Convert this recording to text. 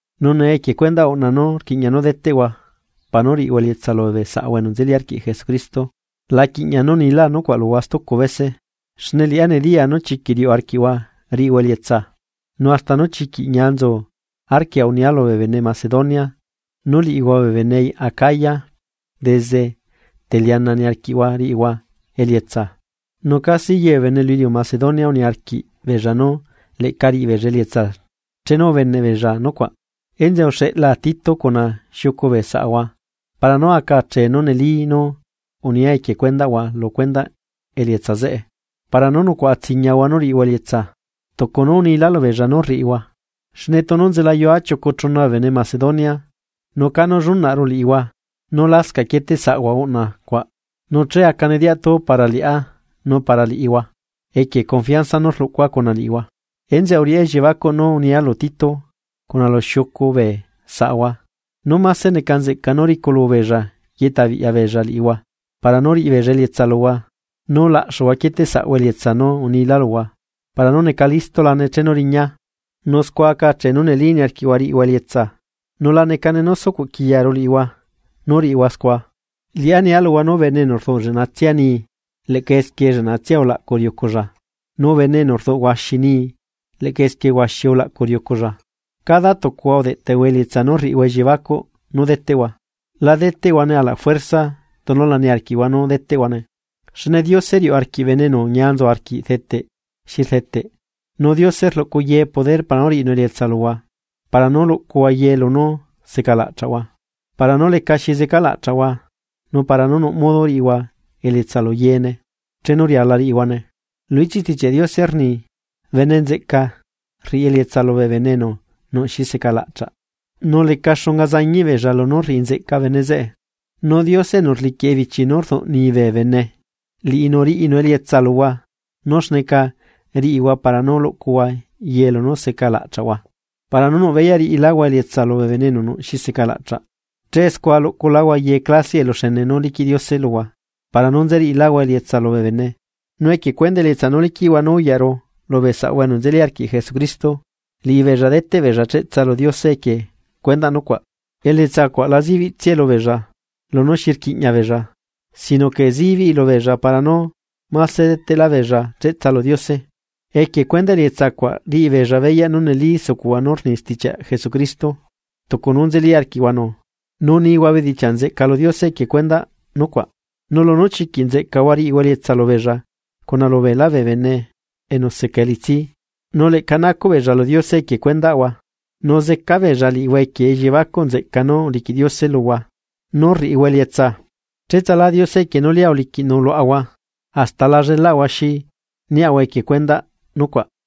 Nu nee equie cuendaꞌ uꞌna nú rquiꞌña nú deteꞌhua para nú riꞌihua elietsa lubee saꞌahua enu nzeli arquiꞌ Jesucristo, la quiꞌña nú nila nucuaꞌ luhua stucu bese. Xne liꞌá nediyaa nú chiquiꞌ riuꞌ arquiꞌhua riꞌihua elietsa. Nu hasta nú chiquiꞌ ñia nzu arquia unia lubee bene Macedonia nú liꞌihua bee bene acaya desde teliana niarquiꞌhua riꞌihua elietsa, nu casi ye bee bene lu iliu Macedonia uniarquiꞌ beella nú leꞌca riꞌibeella elietsa chenu ubeneꞌ beella nucuaꞌ. Enzeꞌe uxeꞌlaa Tito cuna xiucu bee saꞌahua para nú aca achee nú neli nú unia equie cuendaꞌhua lu cuendaꞌ elietsa zeꞌe, para nú nucuaꞌa tsiñiahua nú riꞌihua elietsa, tucu nú unila lubeella nú rriꞌihua. Xne tunu nzelayua chiucu chuna bee bene Macedonia nu canú llunaꞌru liꞌihua nú lascaꞌ quieteꞌsaꞌhua uꞌna cuaꞌ nu che acane diatu para liꞌá nu para liꞌihua, equie confianza nú rluꞌcua cuna liꞌihua. Enzeꞌe uriꞌá elliebacuꞌ nú unia lu Tito cuna lu xiucu bee saꞌahua nú máse neca nzeꞌca nú riculu beella yeꞌtabiꞌya beella liꞌihua, para nú riꞌibeella elietsa luhua nú laꞌxuhua quieteꞌsaꞌhua elietsa nú unilá luhua para nú neca listulane chenu riñaa. Nu scua aca achee nú neli niarquiꞌhua riꞌihua elietsa, nu la necane nú sucuꞌ quiyaru liꞌihua nú riꞌihua scua. Liꞌá nia luhua nú bene enu rduꞌ lleꞌnatsia nii leꞌca esquie lleꞌnatsia ulaꞌcu riuculla nu bene enu rduꞌ huaxi nii leꞌca esquie huaxi ulaꞌcu riuculla. Cada tucuhua udeꞌtehua elietsa nú rriꞌihua elliebacuꞌ nú deteꞌhua, la deteꞌhuane ala fuerza tunu la niarquiꞌhua nú deteꞌhuane, xne Diose riuꞌ arquiꞌ bene enu ñia nzu arquiꞌ rdeteꞌ xi rdeteꞌ. Nu Diose rluꞌcu yee poder para nú riꞌinu elietsa luhua para nú luꞌcuhua yee lunú seca laꞌchaꞌhua para nú lecaxi zeca laꞌchaꞌhua nu para nú nuꞌ modo riꞌihua elietsa lu yeene chenu riala riꞌihuane. Lu ichiꞌ Stichiaꞌ Diose rni: Bene nzeꞌca, rriꞌi elietsa lubee bene enu nuꞌ xi seca laꞌchaꞌ, nu leca xunga zañiꞌ beella lunú rriꞌi nzeꞌca bene zeꞌe. Nu Diose enu rliquiꞌ ebichi nú rduꞌnii bee bene, liꞌinu riꞌinu elietsa luhua nú xneca riꞌihua para nú luꞌcuhua ye lunú seca laꞌchaꞌhua, para nú nuꞌ beyaꞌ riꞌiláhua elietsa lubee bene enu nuꞌ xi secalaꞌchaꞌ. Che scua luꞌculáhua ye clasiaꞌ eluxene nú liquiꞌ Diose luhua para nú nzeriꞌiláhua elietsa lubee bene. Nu equie cuendaꞌ elietsa nú liquiꞌhua nú uyaꞌru lubee saꞌahua enu nzeli arquiꞌ Jesucristo, liꞌibeella deteꞌ beella cheꞌtsa lu Diose equie cuendaꞌ nucuaꞌ. Elietsa cuaꞌ la zibiꞌtsiae lubeella lunú xi rquiꞌña beella sino que zibiꞌi lubeella para nú máse deteꞌlá beella cheꞌtsa lu Diose. Equie cuendaꞌ elietsa cuaꞌ riꞌi beella beyaꞌ nú neli sucuꞌhua nú rni stichiaꞌ Jesucristo tucu nú nzeli arquiꞌhuanu nu nihua bedichiaꞌ nzeꞌca lu Diose equie cuendaꞌ nucuaꞌ, nu lunú chiquiꞌ nzeꞌcahua riꞌihua elietsa lubeella cuna lubeelá bee bene enu seca elitsi. Nu leꞌca nacuꞌbeella lu Diose equie cuendaꞌhua, nu zeca beella liꞌihua equie elliebacuꞌ nzeꞌca nú uliquiꞌ Diose luhua nú rriꞌihua elietsa. ¡Cheꞌtsala Diose equie nú lia uliquiꞌnu luaꞌahua hasta la llelaꞌahua xi niaꞌahua equie cuendaꞌ nucuaꞌ!